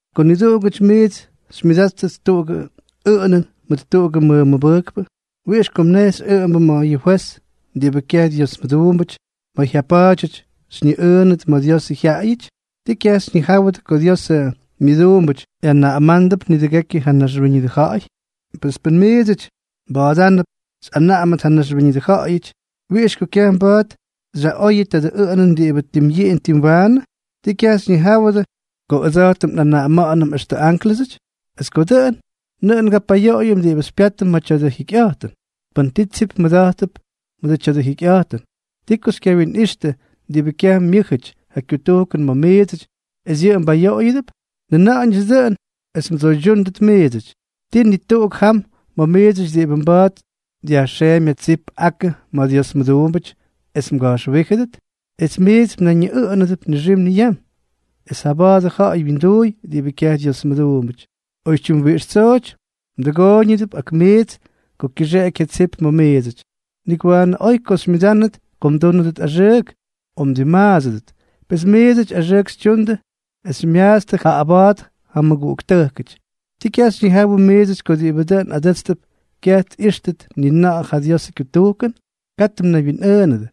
Ko niduꞌugʉty miits xymyʉdáttʉt tuꞌugʉ ʉꞌʉnʉn mʉt tuꞌugʉ mmʉmʉbʉjkpʉ, ¿wiꞌix ko mnejxy ʉꞌʉmbʉ ma̱ yʉ fwez diꞌibʉ kyaj Dyiosmʉduumbʉty, ma̱ jyapa̱a̱dyʉty xymyʉꞌʉʉnʉdʉ ma̱ Diosʉ jyaꞌayʉty? ¿Tii kyaj xyñijáwʉdʉ ko Diosʉ myʉduumbʉty ꞌyanaꞌamándʉp nidʉgekyʉ ja naxwíñʉdʉ ja̱ꞌa̱y? Es pʉn miidsʉty mba̱a̱dánʉp xyꞌanaꞌamʉt ja naxwíñʉdʉ ja̱ꞌa̱yʉty, ¿wiꞌix ko kyaj mba̱a̱t xyaꞌoyʉ tadʉ ʉꞌʉnʉn diꞌibʉ tim yiꞌin tim waanʉ? ¿Tii kyaj xyñijáwʉdʉ ko ʉdsa̱jtʉm nꞌanaꞌama̱ꞌa̱nʉm extʉ ánklʉsʉty? Es ko dʉꞌʉn, ¡nʉꞌʉn ngapayoꞌoyʉm diꞌibʉ xypyátʉm ma̱ tya̱dʉ jikyꞌa̱jtʉn! Pʉn ti tsip mmʉda̱jttʉp ma̱ tya̱dʉ jikyꞌa̱jtʉn, ¿ti ko xykyawinꞌixtʉ diꞌibʉ kyaj myʉ́jʉty ja kyutujkʉn ma̱ miidsʉty, es yʉꞌʉ mbayoꞌoyʉdʉp? Njʉna̱ꞌa̱ñʉts dʉꞌʉn es mdsoydyúndʉt miidsʉty. ¿Tii ni tuꞌuk jam ma̱ miidsʉty diꞌibʉ mba̱a̱t dyajxeemy ja tsip akʉ ma̱ Dios mʉduumbʉty, es mga̱jxwíjʉdʉt? Es miits mnayñiꞌʉꞌʉnʉdʉp nixim niyam, ¡es jaba̱a̱t ja̱ꞌa̱y wyinduuy diꞌibʉ kyaj Dyiosmʉduumbʉty! Oytyim wiꞌix tsooty mdʉgooyñʉdʉp ak miits ko kyʉxeꞌeky ja tsip ma̱ miidsʉty. Nik waanʉ oy ko xymyʉdánʉdʉt ko mdúnʉdʉt axʉʉk o mdimmaadsʉdʉt. Pes miidsʉty axʉʉk xytyundʉ es xymyaatstʉ, jaꞌaba̱a̱t ja mmʉguꞌuktʉjkʉty. ¿Tii kyaj xyñijáwʉdʉ miidsʉty ko diꞌibʉ dʉꞌʉn adʉ́tstʉp kyaj tꞌíxtʉt ni na̱ꞌa̱ ja Diosʉ kyutujkʉn? Katʉ mnaywyinꞌʉʉnʉdʉ.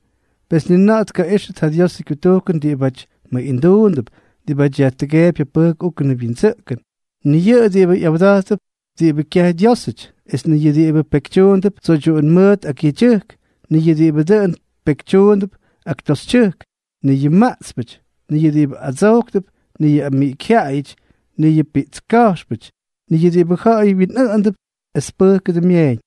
Pes ni na̱ꞌa̱ tkaꞌíxtʉt ja Diosʉ kyutujkʉn diꞌibáty mʉꞌinduundʉp, diꞌibáty yajtʉgeepy ja pʉjk úkʉnʉ wyindsʉꞌkʉn, ni yʉ diꞌibʉ ꞌyawda̱jttʉp diꞌibʉ kyaj Dyiósʉty, ni yʉ diꞌibʉ pekytyuundʉp tsoydyuꞌun mʉʉt ak yedyʉjk, ni yʉ diꞌibʉ dʉꞌʉn pyekytyundʉ ak toxytyʉjk, ni yʉ maꞌtspʉty, ni yʉ diꞌibʉ adsojktʉp, ni yʉ amiꞌikyjyaꞌayʉty, ni yʉ piꞌtska̱jxpʉty, ni yʉ diꞌibʉ ja̱ꞌa̱y wyinꞌʉꞌʉndʉp es tpʉjkʉdʉ myeeñ.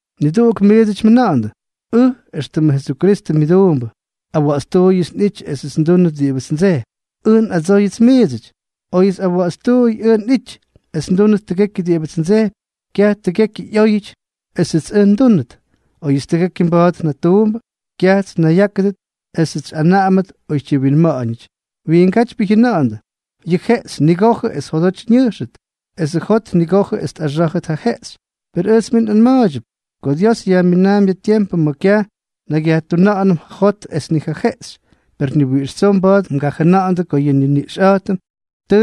Niduꞌugʉty miits mjʉna̱ꞌa̱ndʉ: “Ʉj éxtʉmʉ Jesukristʉ myʉduumbʉ, awa̱ꞌa̱tstuuyʉts nꞌity esʉts ndúnʉt diꞌibʉts ndsejpy.” Ʉj nꞌadsóyʉts miidsʉty: Oyʉts awa̱ꞌa̱tstuuy ʉj nꞌity es ndúnʉt tʉgekyʉ diꞌibʉts ndsejpy, kyaj tʉgekyʉ ꞌyóyʉty esʉts ʉj ndúnʉt. Oyʉts tʉgekyʉ mba̱a̱t njatuumbʉ, kyajts nnayyákʉdʉt esʉts xyꞌanaꞌamʉt oytyi winma̱ꞌa̱ñʉty. Wiingátypyʉ mjʉna̱ꞌa̱ndʉ: “Yʉ jeꞌxy nigojʉ es jodoty ñʉjxʉt, esʉ jot nigojʉ es tꞌaxá̱jʉt ja jeꞌxy.” Per ʉjts mij nꞌanma̱a̱ydyʉp ko Dios yajminaampy ja tiempʉ ma̱ kyaj nnakyyajtuna̱ꞌa̱nʉm ja jot es ni ja jeꞌxy. Per ni wiꞌix tsoo mba̱a̱t mgajʉna̱ꞌa̱ndʉ ko yʉ nniniꞌxꞌa̱jtʉm tʉ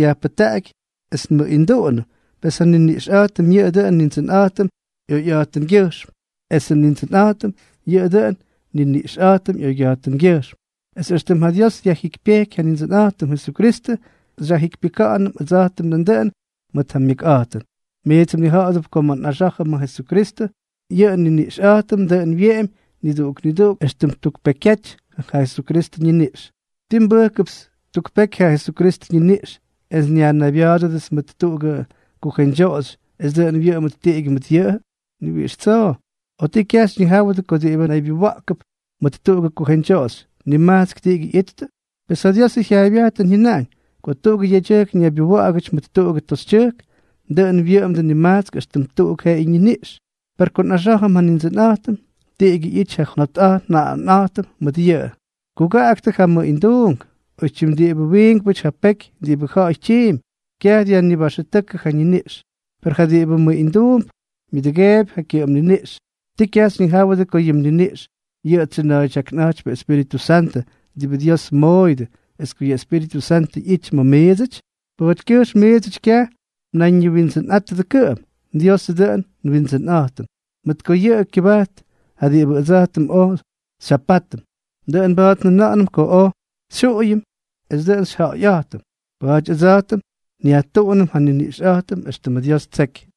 yajpʉjtaꞌaky es nmʉꞌinduꞌunʉm, pes ja nniniꞌxꞌa̱jtʉm yʉꞌʉ dʉꞌʉn Nindsʉnꞌa̱jtʉm ꞌyoyꞌa̱jtʉngyʉjxm, esʉ Nindsʉnꞌa̱jtʉm yʉꞌʉ dʉꞌʉn nniniꞌxꞌa̱jtʉm ꞌyoyꞌa̱jtʉngyʉjxm. Es éxtʉm ja Dios dyajjikypyejky ja Nindsʉnꞌa̱jtʉm Jesukristʉ, xyajjikypyʉka̱ꞌa̱nʉm ʉdsa̱jtʉm nandʉꞌʉn mʉt ja myʉkꞌa̱jtʉn. Miits mnija̱ꞌa̱dʉp ko ma̱ nꞌaxá̱jʉm ja Jesukristʉ, yʉ nniniꞌxꞌa̱jtʉm dʉꞌʉn wyeꞌemy niduꞌuk niduꞌuk éxtʉm tuk pekyjyaty ja Jesukristʉ ñiniꞌx. ¿Tii nbʉjkʉpts tuk peky ja Jesukristʉ ñiniꞌx es nyajnaybya̱a̱dʉdʉts mʉt tuꞌugʉ kujeñdyoꞌoxy es dʉꞌʉn wyʉꞌʉmʉt tiꞌigyʉ mʉt yʉꞌʉ? ¡Ni wiꞌix tsoo! ¿O tii, kyaj xyñijáwʉdʉ ko diꞌibʉ naybyuwa̱ꞌkʉp mʉt tuꞌugʉ kujeñdyoꞌoxy, nimajtsk tiꞌigyʉ ꞌyittʉ? Pes ja Diosʉ jyaaybyajtʉn jyʉnaꞌañ: “Ko tuꞌugʉ yedyʉjk ñaybyuwa̱ꞌa̱gʉty mʉt tuꞌugʉ toxytyʉjk, dʉꞌʉn wyʉꞌʉmdʉ nimajtsk éxtʉm tuꞌuk jeꞌeyʉ niniꞌx.” Per ko nꞌaxá̱jʉm ja Nindsʉnꞌa̱jtʉm, tiꞌigyʉ ꞌyity ja njot nja̱ꞌa̱jʉnꞌa̱jtʉm mʉt yʉꞌʉ. Kugaꞌaktʉ ja mʉꞌinduunk. Oytyim diꞌibʉ wiinkpʉty ja peky diꞌibʉ ja̱ꞌa̱y tyiimpy, kyaj dyajnibaxʉtʉ́kʉ ja ñiniꞌx. Per ja diꞌibʉ mʉꞌinduump, myʉdʉgeepy ja kyʉꞌʉm niniꞌx. ¿Tii kyaj xyñijáwʉdʉ ko yʉ mniniꞌx yʉꞌʉ tsyʉna̱a̱ydyáknʉ Espíritʉ Santʉ, diꞌibʉ Dios mmooyʉdʉ, es ko ja Espíritʉ Santʉ ꞌyity ma̱ miidsʉty? Pa̱a̱tykyʉjxm miits kyaj mnayñiwindsʉnꞌátʉdʉ kʉꞌʉm, Diosʉ dʉꞌʉn nWindsʉnꞌa̱jtʉm, mʉt ko yʉꞌʉ kyʉbajt ja diꞌibʉ ʉdsa̱jtʉm oj xyjapátʉm. Dʉꞌʉn mba̱a̱t njʉna̱ꞌa̱nʉm ko oj xyjuꞌuyʉm es dʉꞌʉn xyjaꞌayꞌa̱jtʉm. Pa̱a̱ty ʉdsa̱jtʉm nyajtuꞌunʉm ja nniniꞌxꞌa̱jtʉm éxtʉmʉ Dios ttseky.